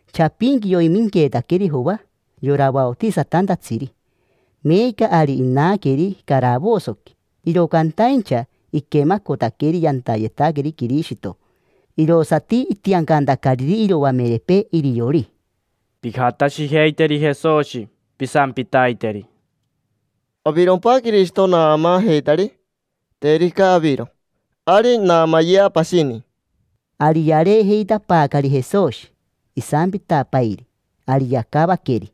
Chapinqui yoiminqueetaqueri Joa, yora vaotisatantatsiri. Meeca ari inaqueri caravosoqui, iro cantaincha iquemacotaqueri yantayetaqueri Quirishito, irosati itiancantacariri iroamerepee iriori: —Pijatashijeiteri Jesoshi, pisampitaiteri: “¿Avirompa Quirishito naamaajeitari? Terica aviro, ari naamayea pashini”. Ari yareejeitapaacari Jesoshi, isampitapairi. Ari yacavaqueri: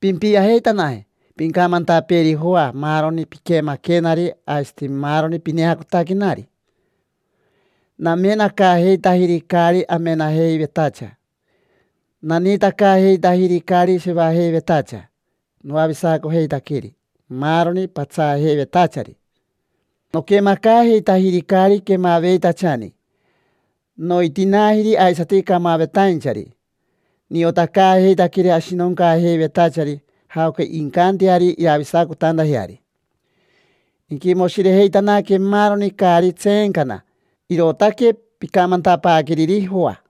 —Pimpiajeitanaje, pincamantapeeri Joa maaroni piquemaquenari aisati maaroni pineacotaquenari. Namenacaajeitajiri caari amenajeivetacha, naniitacaajeitajiri caari shevajeivetacha, noavisacojeitaqueri maaroni patsaajeivetachari, noquemacaajeitajiri caari quemaveitachani, noitinaajiri aisati camavetainchari, niotacaajeitaqueri ashinoncaajeivetachari jaoca incanteari iravisacotantajeari. Inquimoshirejeitanaque maaroni caari tseencana. Irootaque pincamantapaaqueriri Joa.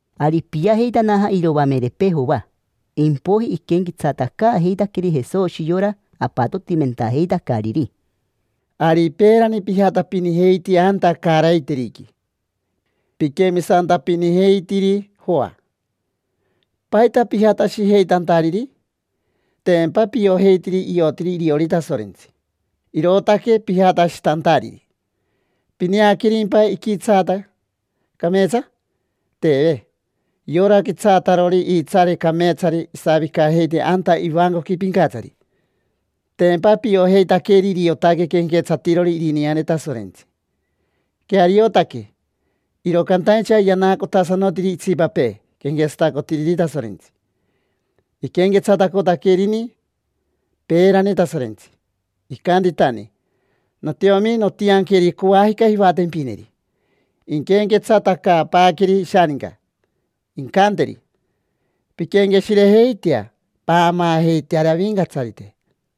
Ari ipiajeitanaja iroamerepee Joa, impoiji iquenquetsatacaajeitaqueri Jesoshi yora apatotimentajeitacariri: —Ari peerani pijatapinijeiti anta caaraiteriqui, piquemisantapinijeitiri Joa. ¿Paita pijatashijeitantariri? Tempa piojeitiri iotiri iriori Tasorentsi, irootaque pijatashitantariri. ¿Pineaquerimpa iquitsaata cameetsa? Teve. Yora quitsaatarori iitsaare cameetsari isavicajeiti anta ivancoqui pincatsari. Tempa piojeitaqueri iriotaque quenquetsatirori irineane Tasorentsi. Queariotaque, iro cantaincha yanaacotasanotiri itsipapee quenquetsatacotiriri Tasorentsi. Iquenquetsatacotaquerini peerani Tasorentsi, icantitanani: “Notiomi, nontianqueri coajica jivatempineri, inquenquetsatacaapaaqueri ishaninca, incanteri: ‘Pinquenqueshirejeitea, paamaajeiteari Avincatsarite’”.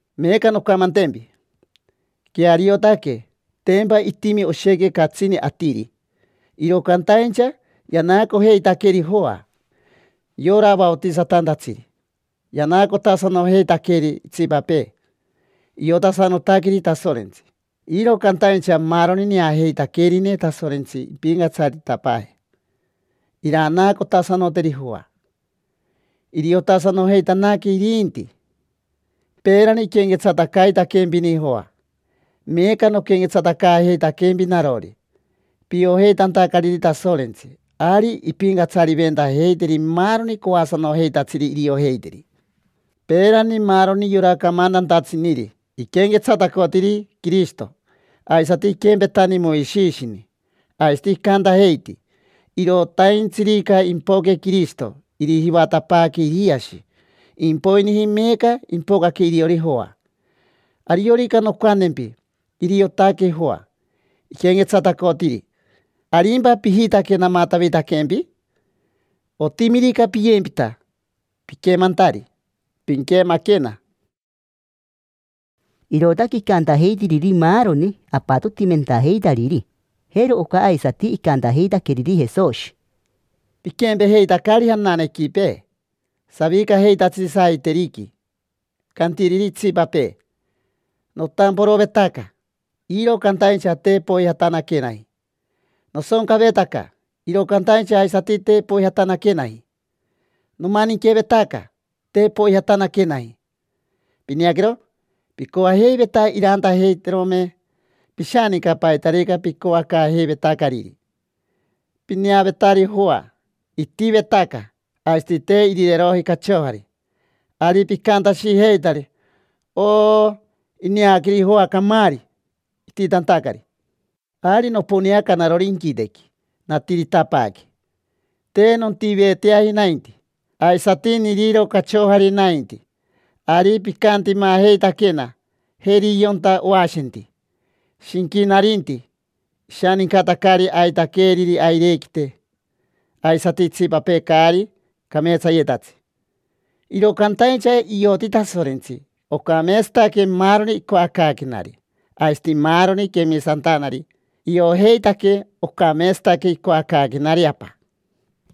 Meeca noncamantempi, queariotaque: tempa itimi oshequi catsini atiri, iro cantaincha yanaacojeitaqueri Joa, yora vaotisatantatsiri. Yanaacotasanojeitaqueri itsipapee, iotasanotaqueri Tasorentsi. Iro cantaincha maaroni neajeitaquerineri Tasorentsi impincatsaritapaaje, iranaacotasanoteri Joa, iriotasanojeitanaque irinti. Peerani iquenquetsatacaitaquempini Joa, meeca noquenquetsatacaajeitaquempi narori, piojeitantacariri Tasorentsi. Ari impincatsariventajeiteri maaroni coasanojeitatsiri iriojeiteri. Peerani maaroni yora camantantatsiniri iquenquetsatacotiri Quirishito, aisati iquempetani Moishishini. Aisati icantajeiti: “Irotaintsirica impoque Quirishito, irijivatapaaqueri Iriashi”. Impoiniji meeca ipocaque iriori Joa, ariorica noncantempi: iriotaque Joa iquenquetsatacotiri, ¿arimpa pijitaque namatavitaquempi? Otimirica piyempita piquemantari, pinquemaquena. Irootaque icantajeitiriri maaroni apatotimentajeitariri. Jero oca aisati icantajeitaqueriri Jesoshi: —Piquempejeitacari jananequipee, savicajeitatsiri saiteriqui, cantiriri itsipapee: “Notamporovetaca, iro cantaincha te poijatanaquenaji; nosoncavetaca, iro cantaincha aisati te poijatanaquenaji. Nomaninquevetaca, te poijatanaquenaji”. Pineaquero, picoajeiveta irantajeiterome pishaninca paitarica picoacaajeivetacariri. Pineavetari Joa, itivetaca aisati te irireroji cachojari, ari picantashijeitari: “Oo, ineaqueri Joa camaari, ititantacari”. Ari noponeaca narori inquitequi, natiritapaaque; te nontiveteaji nainti, aisati niriro cachojari nainti. Ari picantimajeitaquena: “Jeri yonta oashenti, shinquinarinti. Ishanincatacari aitaqueeriri airequite aisati itsipapee caari cameetsayetatsi”. Iro cantaincha ioti Tasorentsi, ocameetsataque maaroni icoacaaquenari; aisati maaroni quemisantanari, iojeitaque ocameetsataque icoacaaquenari Apa.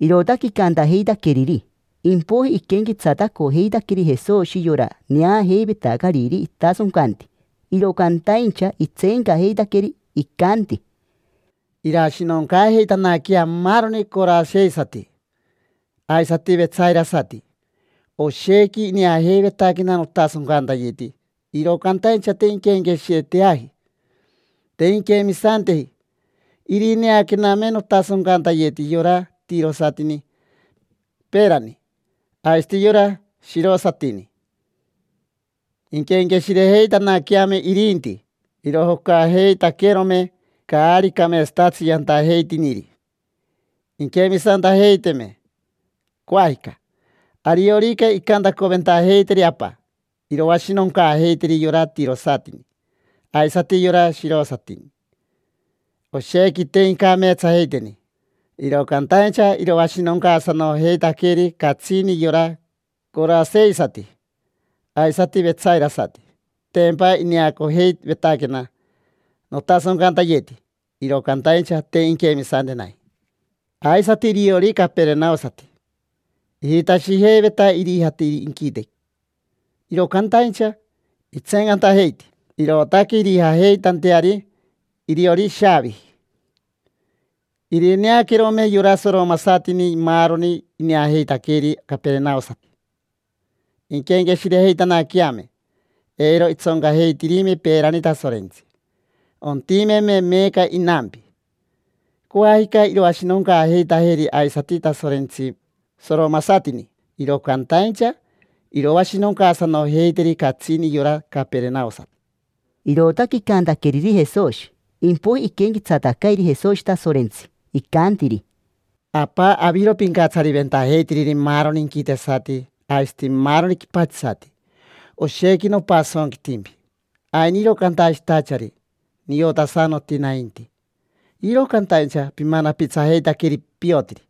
Irootaque icantajeitaqueriri. Impoiji iquenquetsatacojeitaqueri Jesoshi yora neajeivetacariri itasoncanti, iro cantaincha itseencajeitaqueri. Icanti: —Irashinoncaajeitanaquea maaroni coraseisati, aisati vetsairasati. Oshequi ineajeivetaquena notasoncantayeti, iro cantaincha te inquenqueshireteaji, te inquemisanteji. Irineaquename notasoncantayeti yora tirosatini peerani, aisati yora shirosatini, inquenqueshirejeitanaqueame irinti, irojocajeitaquerome caari cameetsatatsi yantajeitiniri, inquemisantajeiteme. Coajica, ariorica incantacoventajeiteri Apa, iroashinoncaajeiteri yora tirosatini aisati yora shirosatini: oshequi te incameetsajeiteni. Iro cantaincha iroashinoncaasanojeitaqueri catsini yora coraseisati aisati vetsairasati: tempa ineacojeivetaquena notasoncantayeti, iro cantaincha te inquemisantenaji. Aisati iriori caperenaosati, ijitashijeiveta irijate inquitequi, iro cantaincha itseencantajeiti: irootaque irijajeitanteari iriori ishaaviji. Irineaquerome yora soromasatini maaroni ineajeitaqueri caperenaosati, inquenqueshirejeitanaqueame, eiro itsoncajeitirime peerani Tasorentsi, ontimeme meeca inampi. Coajica iroashinoncaajeitajeri aisati Tasorentsi soromasatini, iro cantaincha iroashinocaasanojeiteri catsini yora caperenaosati. Irootaque icantaqueriri Jesoshi. Impoiji iquenquetsatacairi Jesoshi Tasorentsi, icantiri: —Apa, aviro pincatsariventajeitiriri maaroni inquitesati aisati maaroni quipatsisati, oshequi nopasonquitimpi. Ainiro cantashitachari: “Niotasanoti nainti”, iro cantaincha pimanapitsajeitaqueri piotiri.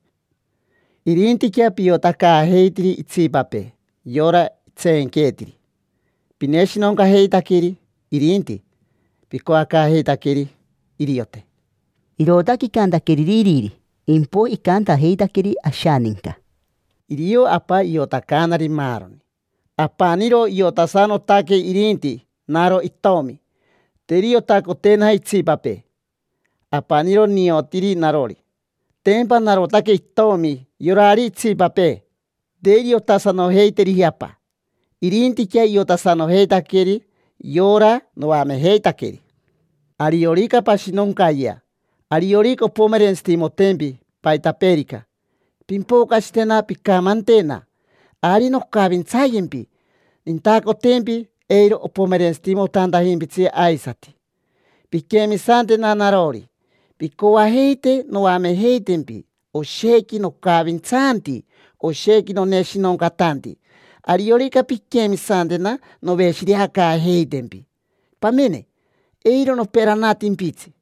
Irintiquea piotacaajeitiri itsipapee, yora itseenqueetiri. Pineshinoncajeitaqueri irinti, picoacaajeitaqueri iriote. Irootaque icantaqueriri iriri, impoiji icantajeitaqueri ashaninca: —Irio Apa iotacaanari maaroni. Apaniro iotasanotaque irinti naro itomi, te iriotacotenaji itsipapee. Apaniro niotiri narori, tempa narotaque itomi; yorari itsipapee, te iriotasanojeiteriji Apa. Irintiquea iotasanojeitaqueri yora noamejeitaqueri. Ariorica pashinoncayea, ariorica ompomerentsitimotempi paitapeerica, pimpocashitena pincamantena; ari noncavintsayempi, nintacotempi eiro opomerentsitimotantajimpitsi aisati. Pinquemisantena narori, pincoajeite noamejeitempi; oshequi nocavintsanti, oshequi noneshinoncatanti. Ariorica pinquemisantena, noveshireacaajeitempi. Pamene, eiro noperanatimpitsi,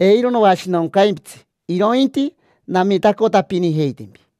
eiro noashinoncaimpitsi, irointi namitacotapinijeitempi.